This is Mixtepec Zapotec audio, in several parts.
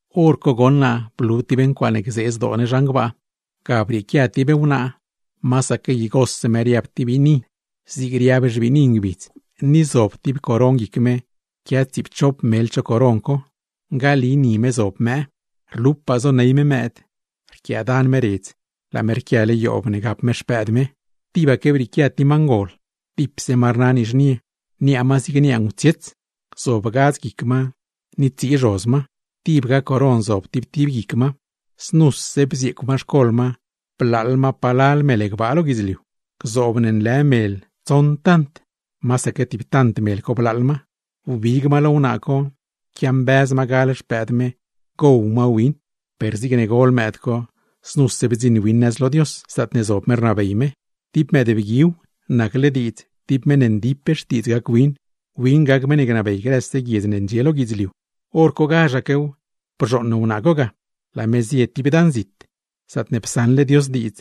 Horco goṉ naa blu tib ncuaaṉe gzee zdoo ne zhan gbaa. Ga brieequia tib wnaa, masaque igose me riab tib biini, zig riab xbiini ngbidz, ni zob tib coron guic me, quia tsiipchop mel cho coron co; ngali ni me zob mëë. Rlupaa zoney me mëëd, rquiaadan me redz, laa me rquiale yoob ne gap me xpëëd me. Tibaque brieequia tib ma ngol, dipse ma rna nizhnie, niaa ma zigne niaa ngutsiets; zob gadz guic ma, ni tsii zhoz ma, tibga coron zob tib tib guic ma. Znuse bzieecw ma xcol ma, blaaḻ ma palal mel gbaa lo guidzliu; gzoob ne nlë mel tsoṉ tant, masaque tib tant mel co blaaḻ ma. Wbig ma lo wnaa co, quiambëz ma gal xpëëd me, parne gow ma win. Per zigne gol mëëd co, znuse bdziṉ win nëz lo Dios, zaatne zob me rnabey me; tib mëëdbguiw, nacle diidz tib meṉ ndip xtiidz gac win, win gac meṉ ne gnabey grëse guiedz ne ndxie lo guidzliu. Horcogazhaquew bzhooṉ wnaa co ga, laa me zie tib dan zit, zaatne psaṉle Dios diidz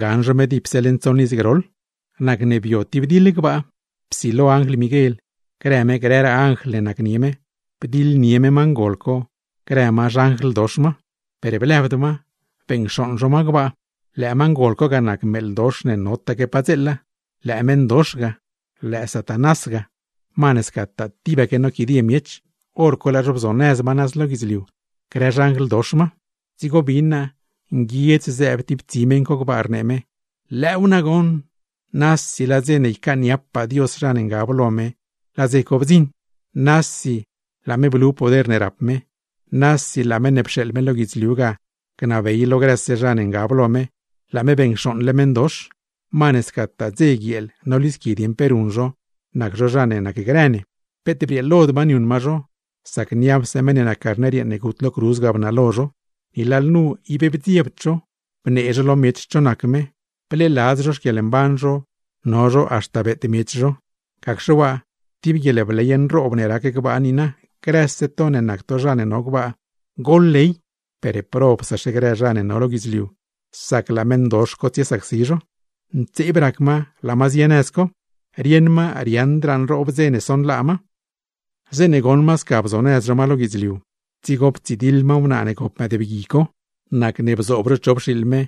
gaṉ zho me dipse leṉ tsoṉ iz groḻ. Nacne bio tib diḻ gbaa. Psilo anjl Miguel, grë me grëraa anjl ne nacnie me, bdiḻnie me ma ngol co grë ma xanjl dox ma; per blëbd ma, beṉcxooṉ zho ma gbaa. Lëë ma ngol co ga nac meeḻ dox ne notaque padzeela, lëë meṉdox ga, lëë Satanás ga, ma ne scataa tibaque noquidie miech; hor co laa zho bzonëz ma nëz lo guidzliu, grë xanjl dox ma. Dzigo bin naa, nguiedz zëëb tib tsi meṉ co gbaa, rnee me: ¡Lëëw nagoṉ! ¡Nasi laa dze ne ycaaniapaa Dios zha ne ngab lo me, laa dze co bdziṉ! Nasi laa me blu poder ne rap me, nasi laa Meṉ ne pxeeḻ me lo guidzliu ga gnabey lo grëse zha ne ngab lo me. ¡Laa me beṉcxooṉle meṉdox! Ma ne scataa dze guieel nolisqui dieṉ pe ruṉ zho, nac zho zha ne nacgrë ne. Peet brieelod ma niuṉ ma zho, sac niapse meṉ ne nac Carner yeeṉ ne gut lo cruz ga bnalo zho; ni lalnu ib bdziebd zho, bnee zho lo miech cho nac me, bleeladz zho xquieḻmban zho, no zho haxta beet miech zho. ¡Gacxe waa tib guieḻbley nroob ne rac gbaa niina! ¡Grëse to ne nac to zha ne no gbaa, goḻley! ¡Per probsaxe grë zha ne no lo guidzliu, sac laa meṉdox co tsiesacsi zho! Ntseeb rac ma laa ma zie nëz co, rieṉ ma riaaṉdraa nroob dze ne sonlaa ma. Zeeṉe goṉ ma sca bzonëz zho ma lo guidzliu, dzigo ptsidiḻ ma wnaa ne gop mëëdbgui co. Nacne bzoob zho chop xiiḻ me,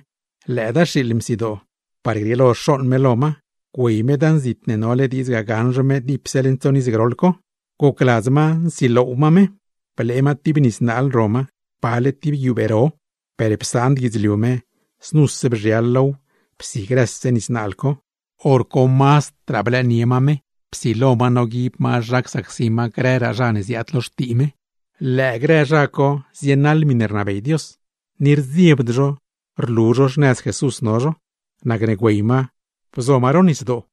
lëëdaa xiiḻ msidoo; par grieelo xooṉ me lo ma, guey me dan zit ne nole diidz gaṉ zho me dipse leṉ tsoṉ iz groḻ co. Gocladz ma nsiloow ma me, blee ma tib nis naal ro ma, pale tib guiubee ro, per psaand guidzliu me, znuse bzhial low psi grëse nis naal co. Horco mazdraa blëënie ma me, psilo ma noguib ma zha csacsi ma grëraa zha ne ziaad lo xtii me. Lëë grë zha co zienaḻ miṉe rnabey Dios, ni rdziebd zho rlu zho xnëz Jesús no zho. Nacne güey ma, bzo ma ro nisdoo.